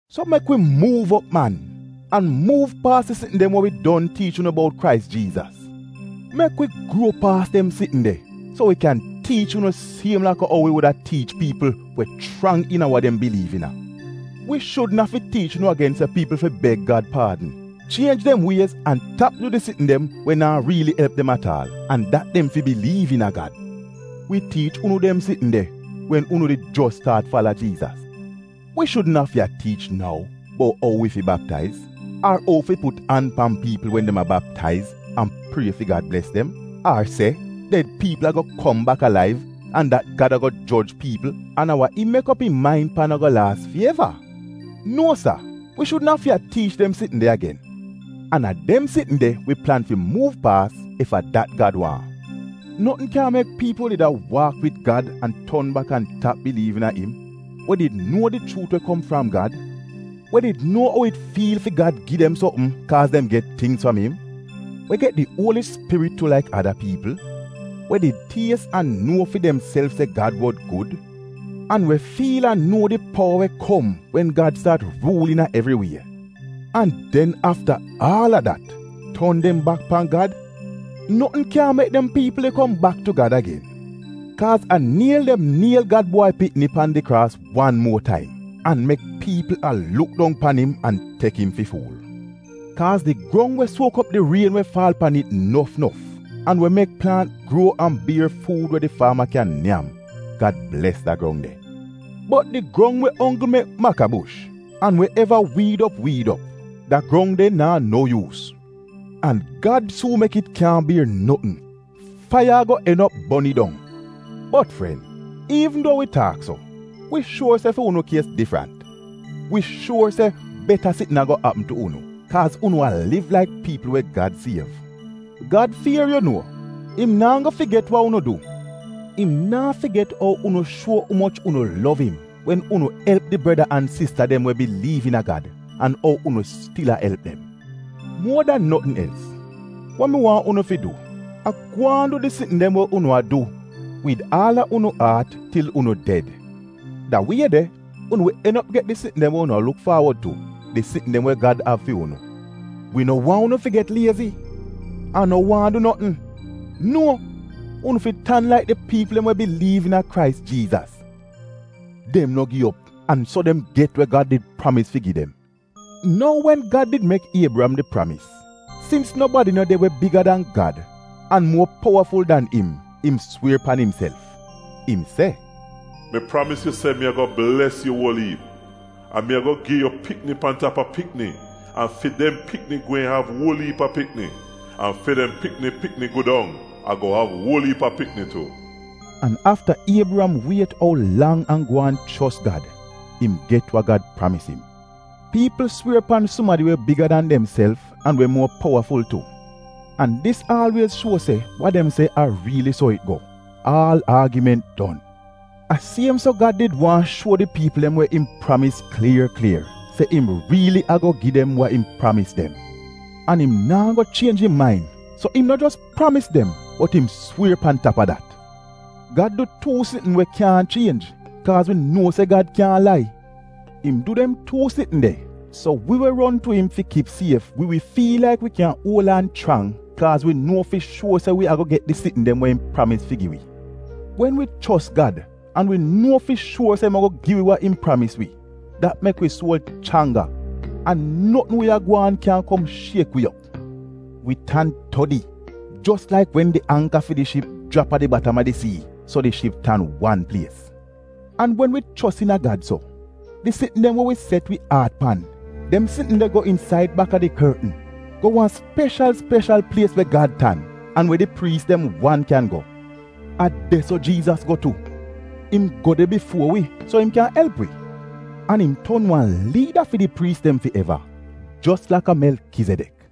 So, mek wi muuv op man, an muuv paas di sitn dem we wi don tiich unu bout Krais Jiizas. Mek wi gruo paas dem sitn de so wi kyan tiich unu siem laka ou wi wuda tiich piipl we chrang iina wa dem biliiv iina. Wi shudn afi tiich unu agen se piipl fi beg Gad paadn, chienj dem wiez an tap du di sitn dem we naa riili elp dem at aal, an dat dem fi biliiv iina Gad. Wi tiich unu dem sitn de wen unu did jos staat fala Jiizas. Wi shudn afi a tiich nou bout ou wi fi baptaiz, ar ou fi put an pan piipl wen dem a baptaiz an prie fi Gad bles dem, ar se ded piipl ago kom bak alaiv an dat Gad ago joj piipl an a wa im mek op im main pan ago laas fi eva — nuo sa, wi shudn afi a tiich dem sitn de agen. An a dem sitn de wi plan fi muuv paas, ef a dat Gad waahn. Notn kyaahn mek piipl we did a waak wid Gad an ton bak an tap biliiv iina im, we did nuo di chuut we kom fram Gad, we did nuo ou it fiil fi Gad gi dem sopm kaaz dem get tingz fram im, we get di Uoli Spirit tu laik ada piipl, we did ties an nuo fi demself se Gad wod gud, an we fiil an nuo di powa we kom wen Gad staat ruul iina evri wie, an den afta aal a dat ton dem bak pan Gad, notn kyaahn mek dem piipl de kom bak tu Gad agen. Kaaz a niel dem a niel Gad Bwai Pikni pan di kraas wan muo taim, an mek piipl a luk dong pan im an tek im fi fuul. Kaaz di grong we suok op di rien we faal pan it nof nof, an we mek plaant gruo an bier fuud we di faama kyan nyam, Gad bles da grong de. Bot di grong we onggl mek makabush an we eva wiid op wiid op, da grong de naa no yuus, an Gad suun mek it kyaahn bier notn; faiya ago en op bon it dong. Bot fren, iivn duo wi taak so, wi shuor se fi unu kies difrant — wi shuor se beta sitn ago apm tu unu, kaaz unu a liv laik piipl we Gad siev. Gad fier, yu nuo. Im naa go figet wa unu du. Im naa figet ou unu shuo umoch unu lov im wen unu elp di breda an sista dem we biliiv iina Gad, an ou unu stil a elp dem. Muo dan notn els, wa wi waahn unu fi du, a gwaan du di sitn dem we unu a du wid aal a unu aat til unu ded. Da wie de unu wi en op get di sitn dem we unu a luk faawod tu; di sitn dem we Gad av fi unu. Wi no waahn unu fi get liezi an no waahn du notn. Nuo, unu fi tan laik di piipl dem we biliiv iina Krais Jiizas; dem no gi op an so dem get wa Gad did pramis fi gi dem. Nou wen Gad did mek Iebriyam di pramis, sins nobadi no de we biga dan Gad an muo powaful dan im, im swier pan imself. Im se, “Mi pramis yu se mi ago bles yu uol iip, an mi ago gi yu pikni pan tap a pikni, an fi dem pikni gweehn av uol iip a pikni, an fi dem pikni pikni gu dong ago av uol iip a pikni tu!” An afta Iebriyam wiet ou lang an gwaan chos Gad, im get wa Gad pramis im. Piipl swier pan sumadi we biga dan demself an we muo powaful tu, an dis aalwiez shuo se wa dem se a riili so it go — aal aagiment don. A siem so Gad did waahn shuo di piipl dem we im pramis klier klier se im riili ago gi dem wa im pramis dem, an im naa go chienj im main, so im no jos pramis dem, bot im swier pan tap a dat. Gad du tuu sitn we kyaahn chienj, kaaz wi nuo se Gad kyaahn lai. Im du dem tuu sitn de, so wi we ron tu im fi kip sief, wi wi fiil laik wi kyan uol aan chrang kaaz wi nuo fi shuor se wi ago get di sitn dem we im pramis fi gi wi. Wen wi chos Gad, an wi nuo fi shuor se im ago gi wi wa im pramis wi, dat mek wi suol chrangga an notn we a gwaan kyaahn kom shiek wi op. Wi tan todi jos laik wen di angka fi di ship jrap a di batam a di sii so di ship tan wan plies. An wen wi chos iina Gad so, di sitn dem we wi set wi aat pan, dem sitn de go insaid baka di kortn, go wan speshal speshal plies we Gad tan an we di priis dem wan kyan go. A de-so Jiizas go tu. Im go de bifuo wi so im kyan elp wi. An im ton wan liida fi di priis dem fi eva, jos laka Melkizedek.